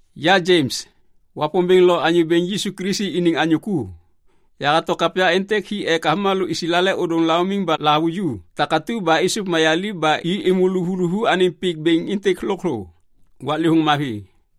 Ya Jems, Wapômbêŋ lo Anyô Bêŋ Yisu Kilisi iniŋ anyô ku. Yahato kapya êntêk hi ek avômalô Islael ôdôŋ laumiŋ ba lahavuju takatu ba êsôv mayaliv ba i êmô luvuluvu anêŋ pik bêŋ êntêk lôkthô. Waklêvôŋ mavi!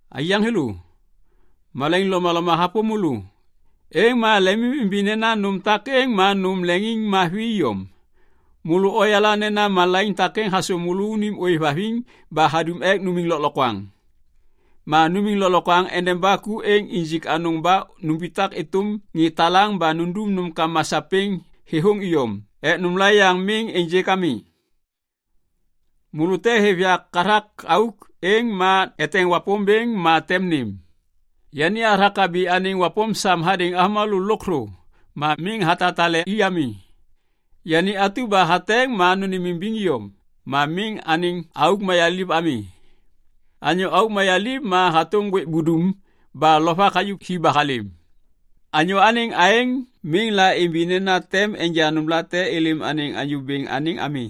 Aiyaŋ thêlô, malaiŋ lomaloma hapôm môlô, êŋ ma lemimimbi nena nôm takêŋ ma nôm leŋiŋmavi iyom. Môlô oyala nena malaiŋ takêŋ hasôm môlônim ôêvhaviŋ ba hadum ek numiŋ lôklokwaŋ. Ma numiŋ lôklokwaŋ endeba ku êŋ injik anôŋ ba numbitak êtôm ŋê talaŋ ba nundum nômkama sapêŋ thêthôŋ iyom ek nômla yaŋ miŋ ênjêk ami. Môlô te hêv yak hathak auk, êŋ ma eteŋ Wapômbêŋ ma tem nêm. Yani hathak habi anêŋ wapôm sam hadêŋ avômalô lôkthô ma miŋ hatatale i ami. Yani atu ba hateŋ ma nêmimbiŋ iyom ma miŋ anêŋ auk mayaliv ami. Anyô auk mayaliv ma hatôm ŋgwêk budum ba lovak hayuv hi ba halêm. Anyô anêŋ aêŋ miŋ laimbi nena tem enja nômlate êlêm anêŋ Anyô Bêŋ anêŋ ami.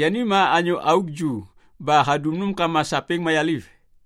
Yani ma anyô auk ju ba hadum nômkama sapêŋ mayaliv.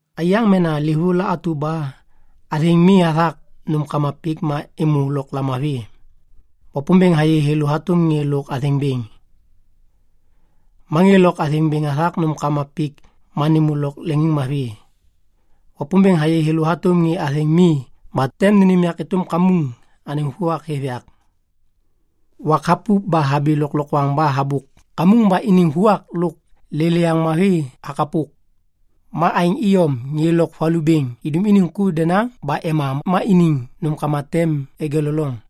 Aiyaŋ mena livôŋ la atu ba athêŋ mi hathak nômkama pik ma êmô lôk lamavi. Wapômbêŋ hayê thêlô hatôm ŋê lôk athêŋ bêŋ. Ma ŋê lôk athêŋ bêŋ hathak nômkama pik ma nêmô lôk leŋiŋmavi. Wapômbêŋ hayê thêlô hatôm ŋê athêŋ mi ba tem nênêm yak êtôm kamuŋ anêŋ vuak hêv yak. Wak hapup ba habi lôklokwaŋ ba habôk kamuŋ ba iniŋ vuak lôk lêlêyaŋ mavi hakapok. Ma aêŋ iyom ŋê lôk valu bêŋ idum iniŋ ku denaŋ ba ema ma iniŋ nômkama tem egeleloŋ.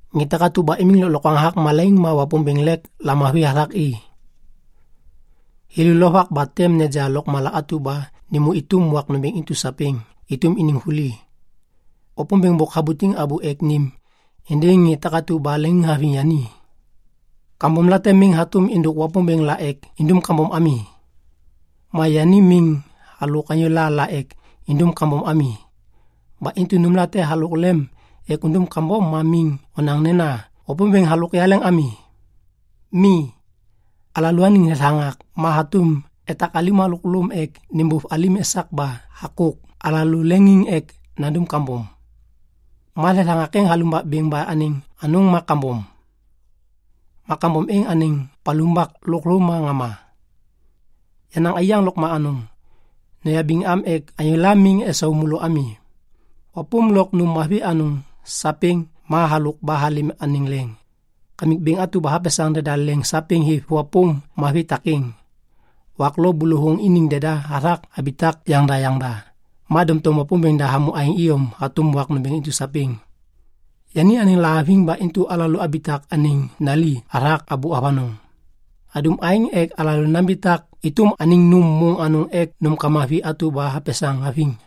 Ŋê takatu ba imiŋ lôklokwaŋ hathak malaiŋ ma Wapômbêŋ lêk lamavi hathak i. Thêlô lovak ba tem neja lôkmala atu ba nêmô êtôm wak nômbêŋ intu sapêŋ êtôm iniŋ vuli. Wapômbêŋ bôk habutiŋ abô ek nêm êndêŋ ŋê takatu ba leŋiŋhaviŋ yani. Kambomlate miŋ hatôm êndôk Wapômbêŋ la ek indum kambom ami. Ma yani miŋ halôk anyôla la ek indum kambom ami. Ba intu nômlate halôk lem ek undum kambom ma miŋ onaŋ nena, “Wapômbêŋ halôk yaleŋ ami.” Mi. Alalôaniŋ thethaŋak ma hatôm etak alim halôk lôm ek nêbôv alim esak ba hakôk alalô leŋiŋ ek nandum kambom. Ma thethaŋak êŋ halumbak bêŋ ba anêŋ anôŋ ma kambom. Ma kambom êŋ anêŋ palumbak lôkthô ma ŋama. Yenaŋ aiyaŋ lôkma anôŋ, noyabiŋ am ek anyôla miŋ esau môlô ami. Wapôm lôk nôm mavi anôŋ sapêŋ ma halôk ba halêm anêŋ leŋ. Kamik Bêŋ atu ba hapesaŋ deda leŋ sapêŋ hêv wapôm mavi takêŋ. Wak lo bôlôvôŋ iniŋ deda hathak habitak yaŋda yaŋda, ma doŋtom Wapômbêŋ da hamô aêŋ iyom hatôm wak nômbêŋ intu sapêŋ. Yani anêŋ lahaviŋ ba intu alalô abitak anêŋ nali hathak abô avanôŋ. Hadum aêŋ ek alalô nambitak êtôm anêŋ nôm môŋ anôŋ ek nômkama vi atu ba hapesaŋ haviŋ.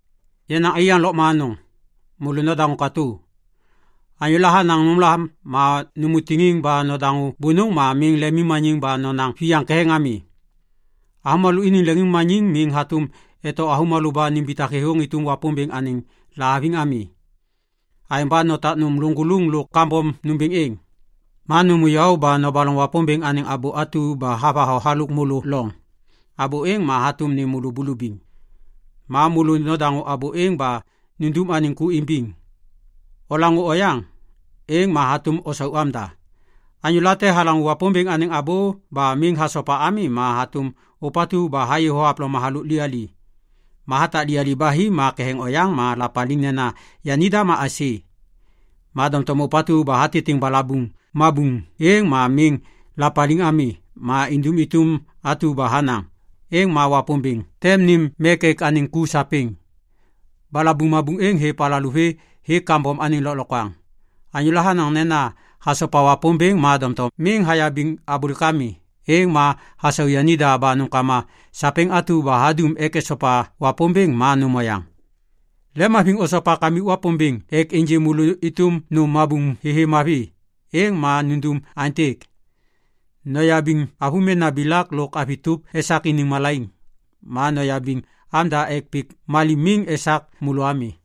Yenaŋ aiyaŋ lôkma anôŋ, môlô nodaŋô katô. Anyôla hanaŋ nômla ma nômô tiŋiŋ ba nodaŋô bônôŋ ma miŋ lemimmaniŋ ba nonaŋ viyaŋ ketheŋ ami. Avômalô iniŋ leŋiŋmaniŋ miŋ hatôm eto avômalô ba nimbitak thêthôŋ êtôm Wapômbêŋ anêŋ lahaviŋ ami. Aêŋ ba notak nôm lôŋgôlôŋ lôk kambom nômbêŋ êŋ. Ma nômô yaô ba nobaloŋ Wapômbêŋ anêŋ abô atu ba havatho halôk môlô loŋ. Abô êŋ ma hatôm nêm môlô bulubiŋ. Ma môlô nodaŋô abô êŋ ba nundum anêŋ ku imbiŋ. Olaŋô oyaŋ, êŋ ma hatôm osau amda. Anyôla te halaŋô Wapômbêŋ anêŋ abô ba miŋ hasopa ami ma hatôm ôpatu ba hayê thohavloma halôk liyali. Ma hatak liyali ba hi ma ketheŋ oyaŋ ma lapaliŋ nena yanida ma aisê. Ma doŋtom ôpatu ba hatitiŋ balabuŋ mabuŋ êŋ ma miŋ lapaliŋ ami ma indum êtôm atu ba hanaŋ, êŋ ma Wapômbêŋ tem nêm mek ek anêŋ ku sapêŋ. Balabuŋ mabuŋ êŋ hêv alalô vê hêk kambom anêŋ lôklokwaŋ. Anyôla hanaŋ nena hasopa Wapômbêŋ ma doŋtom miŋ hayabiŋ abôlêk ami, êŋ ma hasau yanida ba nômkama sapêŋ atu ba hadum ek esopa Wapômbêŋ ma nôm oyaŋ. Lemhaviŋ osopa Kamik Wapômbêŋ ek ênjê môlô êtôm nôm mabuŋ thêthê mavi, êŋ ma nundum aêntêk. Noyabiŋ avômena bilak lôk avi tôp esak iniŋ malaiŋ. Ma noyabiŋ amda ek pik malim miŋ esak môlô ami.